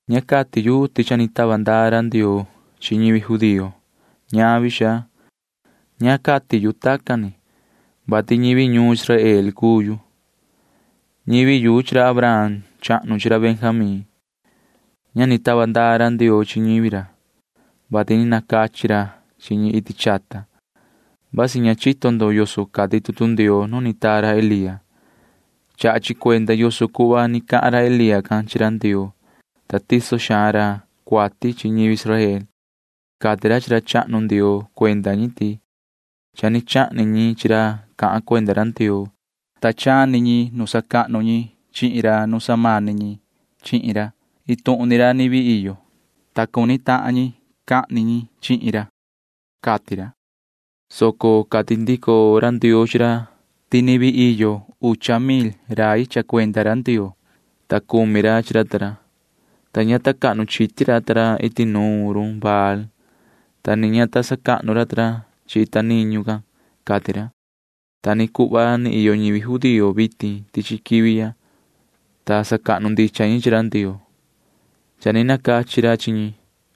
Ña cati yu ti cha ni tava ndaa ra Ndioo chi ñivi judío. Ñavi, xaa. Ña cati yu tacan ni, vati ñivi ñuun Israel cuu yu. Ñivi yu chi ra Abraham chahnu chi ra Benjamín. Ña ni tava ndaa ra Ndioo chi ñivi ra, vati ni nacachi ra chi ñi iti chata. Vasi ña chito ndo yoso cati tutu Ndioo nu ni taa ra Elía. Chaha chi cuenda yoso cuhva ni cahan ra Elía can chi ra Ndioo, ta tiso xaan ra cuati chi ñivi Israel. [Cati ra chi ra chahnu Ndioo cuenda ñi ti] cha ni chahni ñi chi ra cahan cuenda ra Ndioo. Cha ni chani ñi nu sacahnu ñi chihin ra nu samani ñi chihin ra. Iin tuhun ni ra ni vii iyo, ta cuni tahan ñi cahni ñi chihin ra, cati ra, soco cati ndico ra Ndioo chi ra ti ni vii iyo ucha mil rai cha cuenda ra Ndioo, ta cumi ra chi ra ta ra, ta ña ta cahnu chiti ra ta ra iti nuun Baal can, ta ni ña ta sacahnu ra ta ra chi ita niñu can, cati ra. Ta ni cuhva ni iyo ni ñivi judío vitin tichi quivi ya, [ta sacahnu ndicha ñi chi ra Ndioo]. Cha ni nacachi ra chi ñi,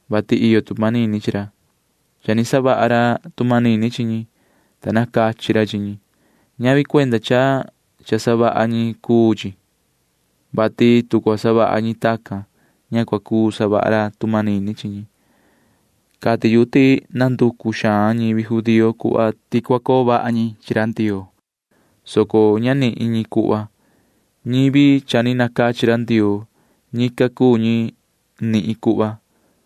vati iyo tu manini chi ra. Cha ni savaha ra tu manini chi ñi, ta nacachi ra chi ñi. Chacan cuu cha ñavi ti iyo cha cua savaha maan ñi, vati tu cua savaha ñi tacan, ña cua cuu ca savaha ra tu manini chi ñi. Cati yu ti nanducu xaan ñivi judío cuhva ti cua coo vaha ñi chi ra Ndioo, soco ña nanihin ñi cuhva. Ñivi cha ni nacachi ra Ndioo―ñican cuu ñi nihin cuhva,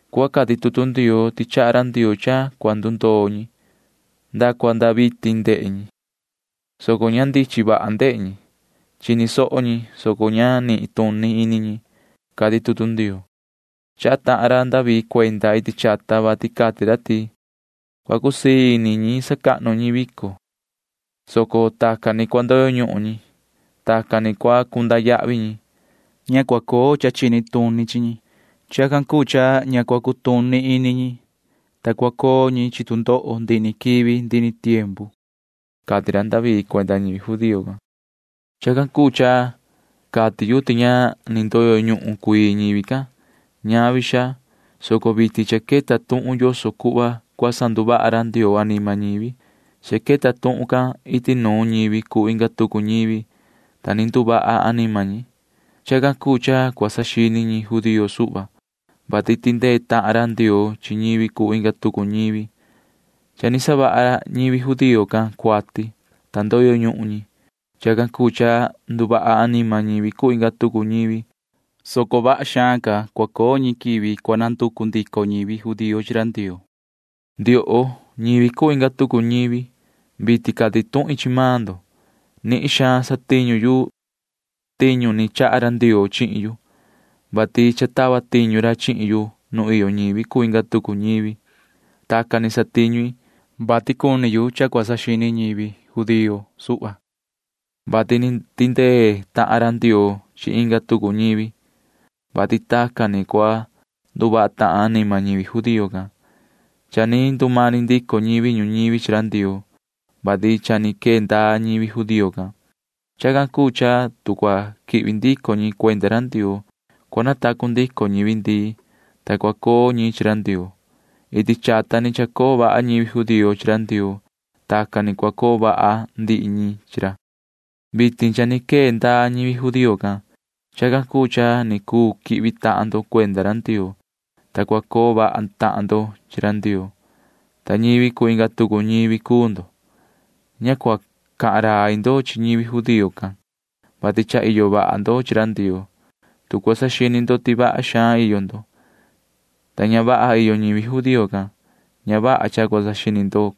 cuhva cati tutu Ndioo ti chaha ra Ndioo cha cua ndutondo ñi. Nda cua nda vitin ndehe ñi, soco ña ndichin vaha ndehe ñi. Chini soho ñi, soco ña nituni ini ñi, cati tutu Ndioo. Chaha tahan ra David cuenda iti chata, vati cati ra ti: Cua cusii ini ñi sacahnu ñi vico, soco tacan ni cua ndoyo ñuhun ñi. Tacan ni cua cunda yahvi ñi. Ña cua coo cha chini tuni chi ñi. Chacan cuu cha ña cua cutuni ini ñi, ta cua coo ñi chi tu ndoho ndihi ni quivi ndihi ni tiempu, cati ra David cuenda ñivi judío can. Chacan cuu cha cati yu ti ña ni ndoyo ñuhun cuii ñivi can. Ñavi, xaa, soco vitin cha queta tuhun yoso cuhva cua sanduvaha ra Ndioo anima ñivi. Cha queta tuhun can iti nuun ñivi cuu inga tucu ñivi, ta ni nduvaha anima ñi. Chacan cuu cha cua saxini ñi judío suhva, [vati tindee tahan ra Ndioo chi ñivi cuu inga tucu ñivi]. Cha ni savaha ñivi judío can cuati, ta ndoyo ñuhun ñi. Chacan cuu cha nduvaha anima ñivi cuu inga tucu ñivi, soco vaha xaan ca cua coo ñi nu cua quihvi ndico ñivi judío cuenda ra Ndioo. Ndioho, ñivi cuu inga tucu ñivi, vitin cati tuhin chi maan ndo. Nihin xaan satiñu i tiñu ni chaha ra Ndioo chihin yu, vati cha tava tiñu ra chihin yu nu iyo ñivi cuu inga tucu ñivi. Tacan ni satiñu i, vati cuni yu cha cua quechaha saxini ñivi judío suhva, vati ni tindee tahan ra Ndioo chi inga tucu ñivi, vati vasi tacan ni cua nduvaha tahan anima ñivi judío can. Cha ni ndumani ndico ñivi ñuñivi chi ra Ndioo, vati cha ni quee ndaa ñivi judío can. Chacan cuu cha tu cua quihvi ndico ñi cuenda ra Ndioo, cua natacu ndico ñivi ndii, ta cua coo ñi chi ra Ndioo. Iti chata ni chacoo vaha ñivi judío chi ra Ndioo. Tacan ni cua coo vaha ndihi ñi chi ra. Vitin cha ni quee ndaa ñivi judío can. Chacan cuu cha ni cuu quihvi maan ndo cuenda ra Ndioo, ta cua coo vaha tahan ndo chi ra Ndioo, ta ñivi cuu inga tucu ñivi cuu ndo. Ña cua cahan rai ndo chi ñivi judío can, [vati cha iyo vaha ndo chi ra Ndioo]. Tu cua saxini ndo ti vaha xaan iyo ndo, ta ña vaha iyo ñivi judío can, na cua saxini ndico ndo,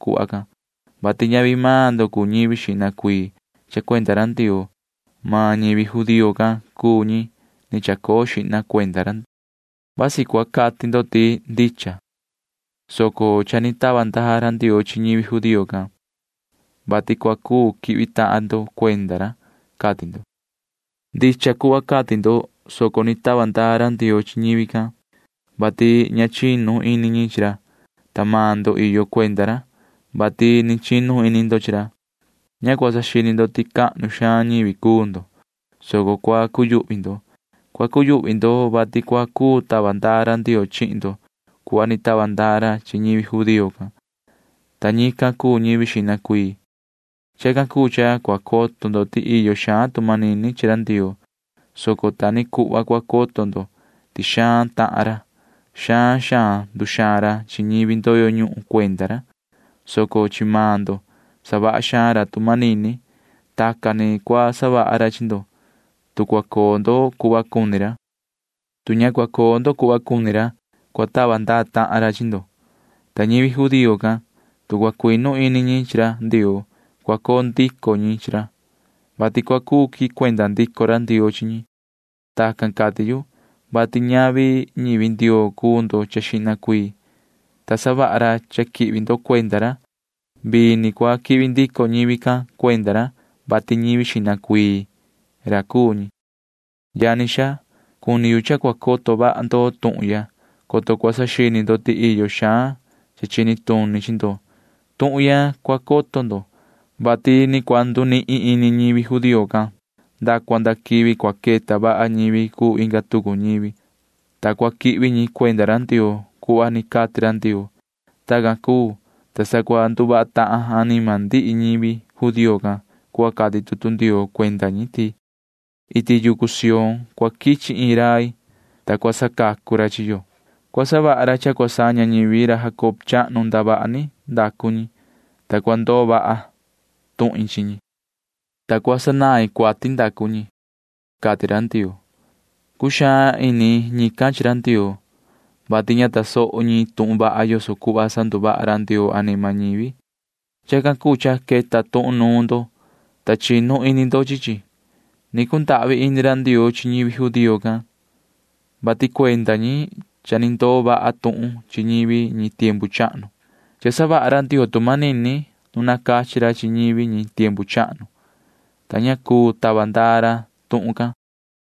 vati ñavi maan ndo cuu ñivi iyo cuenda ra Ndioo xihna cuii. Maan ñivi judío can cuu ñi ni chacoo xihna cuenda ra. Vasi cua cati ndo ti ndicha, soco cha ni tava ndaa ra Ndioo chi ñivi judío can, vati cua cuu quihvi tahan ndo cuenda ra, cati ndo. Ndicha cuhva cati ndo, soco ni tava ndaa ra Ndioo chi ñivi can, vati ña chinu ini ñi chi ra, ta iyo maan ndo cuenda ra, vati ni chinu ini ndo chi ra. Ña cua saxini ndo ti cahnu xaan ñivi cuu ndo, soco cua cuyuhvi ndo. Cua cuyuhvi ndo, vati cua cuu tava ndaa ra Ndioo chihin ndo cuhva ni tava ndaa ra chi ñi judío can, ta ñican cuu ñivi ra xihna cuii. Chacan cuu cha cua coto ndo ti iyo xaan tu manini chi ra Ndioo, soco ta ni cuhva cua coto ndo ti xaan xaan iyo tahan ra. Xaan xaan nduxaan ra chi ñivi ndoyo ñuhun cuenda ra, soco chi maan ndo savaha xaan ra tu manini. Tacan ni cua savaha ra chi ndo, tu ni cua coo ndo chi ra. Tu ñavi tacan ni cua coo ndo chi ra, cua tava ndaa tahan ra chi ndo. Ta ñivi judío can―tu cua cuinu ini ñi chi ra Ndioo, cua coo ndico ñi chi ra, vati cua cuu quihin cuenda ndico ra Ndioo chi ñi. Tacan cati yu, vati ñavi ñivi Ndioo cuu ndo xihna cuii, ta savaha ra cha quihvi ndo cuenda ra. Vii ni cua quihvi ndico ñivi can cuenda ra, vati ñivi ra ni cuu ñi xihna cuii. Yani xaa, cuni yu cha cua coto vaha ndo tuhun ya, coto cua saxini ndo ti iyo cha chini tuni chi ndo. Tuhun ya cua coto ndo, vati ni cua ndusoo ñivi judío can nda cua nda quivi cua queta vaha ñivi cuu inga tucu ñivi, ta cua quihvi ñi cuenda ra Ndioo cuhva ni cati ra Ndioo. Tacan cuu, ta sa cua nduvaha tahan anima ndihi ñivi judío can cuhva cati tutu Ndioo cuenda ñi ti: Iti yucu Sión cua quichi iin rai, ta cua sacacu ra chi yo. Cua savaha ra cha cua saña ñivi ra Jacob chahnu ndavaha ni ndacu ñi, ta cua ndoo vaha tuhin chi ñi, ta cua sanain cuati ndacu ñi, cati ra Ndioo. Cuxaan ini ñican chi ra Ndioo, vati ña tasoho ñi tuhun vaha yoso cuhva sanduvaha ra Ndioo anima ñivi. Chacan cuu cha queta tuhun nuun ndo, ta chinu ini ndo chi chi. Ni cundahvi ini ra Ndioo chi ñivi judío can, vati cuenda ñi cha ni ndoo vaha tuhun chi ñivi ñi tiempu chahnu. Cha ni savaha ra Ndioo tu manini nu ni nacachi ra chi ñivi ñi tiempu chahnu, ta ña cuu tava ndaa ra tuhun can.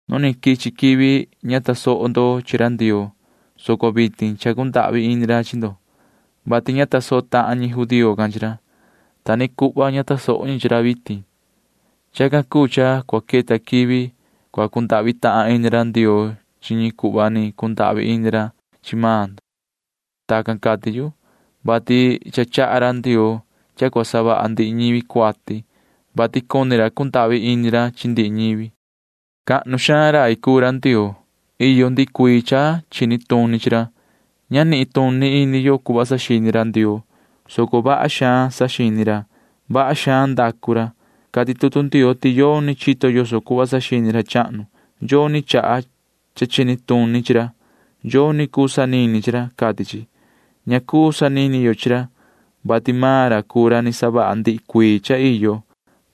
Nu ni quichi quivi ña tasoho ndo chi ra Ndioo, soco vitin cha cundahvi ini ra chi ndo, vati ña tasoho tahan ñi judío can chi ra. Ta ni cuhva ña tasoho ñi chi ra vitin. Chacan cuu cha cua queta quivi cua cundahvi tahan ini ra Ndioo chi ñi cuhva ni cundahvi ini ra chi maan ndo. Tacan cati yu, vati cha chaha ra Ndioo cha cua savaha ndihi ñivi cuati, vati cuni ra cundahvi ini ra chi ndihi ñi. ¡Cahnu xaan rai cuu ra Ndioo! Iyo ndihi cuii cha chini tuni chi ra. Ña nituni ini yo cuhva saxini ra Ndioo, soco vaha xaan saxini ra. Vaha xaan ndacu ra. Cati tutu Ndioo ti yoni chito yoso cuhva saxini ra chahnu. Yoni chaha cha chini tuni chi ra. Yoni cuu sanini chi ra, cati chi. Ña cuu sanini yo chi ra, vati maan ra cuu ra ni savaha ndihi cuii cha iyo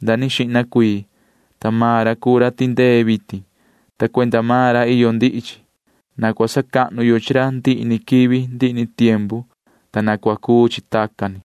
nda ni xihna cuii, ta maan ra cuu ra tindee vitin, ta cuenda maan ra iyo ndihi chi. Na cua sacahnu yo chi ra ndihi ni quivi ndihi ni tiempu, ta na cua cuu chi tacan ni.